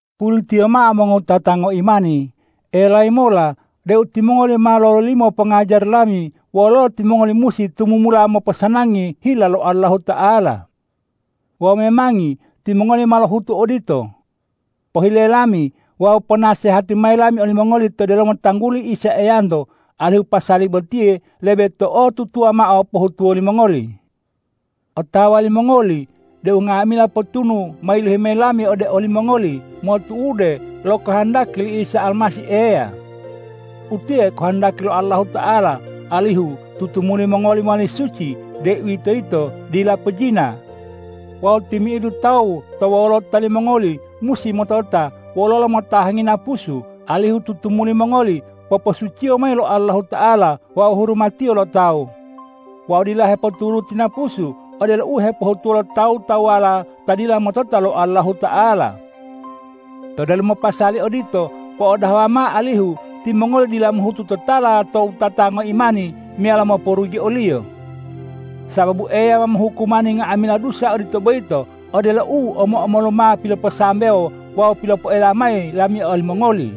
Pulitiyo mao mongowutata ngoimani, elayi mola deu timongoli ma lololimo pongajari lami wololo timongoli musi tumumula moposanangi hila lo Allahuta'ala. Wawu memangi timongoli ma lohutu odito. Pohile lami wawu ponasehati mayi lami olimongoli to delomo tangguli Isa Eyanto, alihu pasali botiye lebe to'otutuwa mao pohutuwo limongoli. Otawa limongoli deu nga'amila potunu ma yilohi mayi lami ode olimongoli motu'ude lo kohondaki li Isa Almasih Eya. Utiye kohondaki lo Allahuta'ala, alihu tutumuli mongoli mowali suci, deuwitoyito dila pojina. Wawu timi'idu tawu to wolota limongoli musi motota wololo motahangi napusu, alihu tutumuli mongoli poposuciyo mayi lo Allahuta'ala, wawu hurumatiyo lo tawu wawu dila hepoturuti napusu, odelo u hepohutuwo lo tawu-tawuwala ta dila motota lo Allahuta'ala. To delomo pasali odito, po'odahawa mao alihu timongoli dila mohutu totala to wutata ngoimani meyalo moporugi oliyo. Sababu Eya ma mohukumani nga'amila dusa odito boyito, odelo u omo-omolu ma piloposambewo wawu pilopoela mayi lami olimongoli.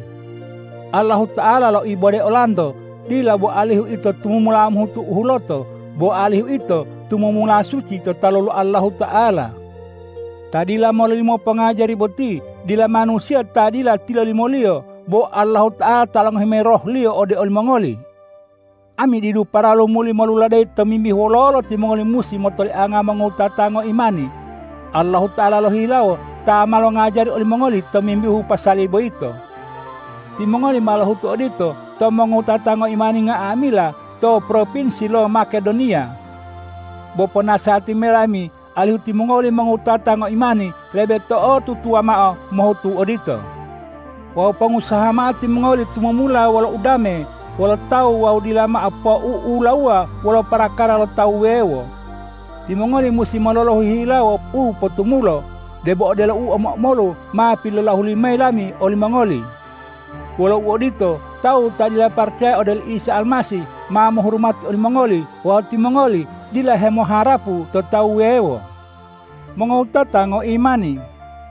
Allahuta'ala loibode olanto, dila bo alihu ito tumumula mohutu u huloto, bo alihu ito tutumula suci to talu lo Allahuta'ala. Ta dila mololimo pongajari boti dila manusiya ta dila tilolimoliyo, bo Allahuta'ala ta longohi mayi Roh-Liyo ode olimongoli. Ami didu paralu muli moluladeyi tomimbihu wololo timongoli musi motolianga mongowutata ngoimani. Allahuta'ala lohihilawo ta ma longajari olimongoli tomimbihu pasali boyito. Timongoli ma lohutu odito to mongowutata ngoimani nga'amila to propinsi lo Makedoniya. Bo ponasehati mayi lami alihu timongoli mongowutata ngoimani lebe to'otutuwa mao mohutu odito. Wawu pongusaha mao timongoli tumumula wolo udame wolo tawu wawu dila mao pou'ulawuwa wolo parakara lo tawu wuwewo. Timongoli musi mololohu hihilawo u potumulo, debo odelo u omo-omolu ma pilolahuli mayi lami olimongoli. Wolo uodito, tawu ta dila paracaya ode oli Isa Almasih, ma mohurumati olimongoli wawu timongoli dila hemoharapu to tawu wuwewo. Mongowutata ngoimani,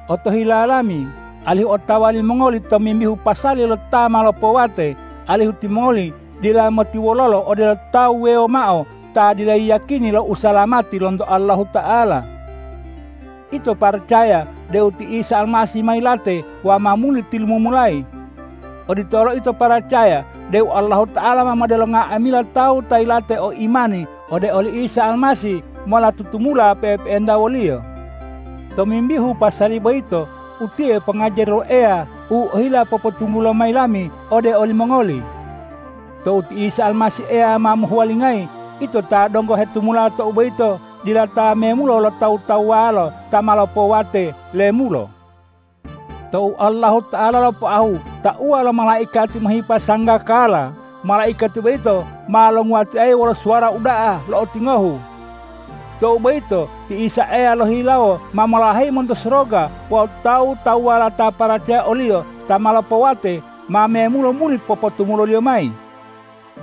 otohila lami alihu otawa limongoli tomimbihu pasali lo ta ma lopowate, alihu timongoli dila motiwololo odelo tawu wuwewo mao ta dila yiyakini lo usalamati lonto Allahuta'ala. Ito paracaya deu ti Isa Almasih ma yilate wawu ma muli tilumumulayi. Odito olo ito paracaya deu Allahuta'ala ma modelo nga'amila tawu ta yilate o imani ode oli Isa Almasih mola tutumula pe'epe'enta wo-Liyo. Tomimbihu pasali boyito, utiye pongajari lo Eya u ohila popotunggulo mayi lami ode olimongoli. Tou ti Isa Almasih Eya ma mohuwalingayi, ito ta donggo hetumula tou boyito dila ta memulo lo tawu-tawuwala ta ma lopowate lemulo. Tou Allahuta'ala lopoahu tauwa lo malaikati mohipa sanggakala, malaikati boyito ma longuwatiayi wolo suwara uda'a lo'otingohu. Tou boyito ti Isa Eya lohihilawo ma molaheyi monto soroga wawu tawu-tawuwala ta paracaya o-Liyo ta ma lopowate ma memulo muli popotumulo-Liyo mayi.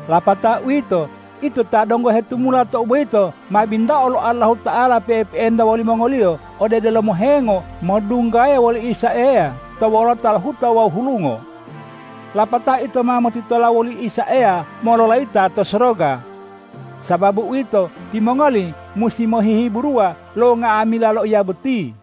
Lapatao uwito, ito ta donggo hetumula tou boyito ma bintao lo Allahuta'ala pe'epe'enta wolimongoliyo ode delomo hengo modunggaya woli Isa Eya to wolota lo huta wawu hulungo. Lapatao ito ma motitola woli Isa Eya mololayita to soroga. Sababu uwito, timongoli musi mohihiburuwa lo nga'amila loiya boti.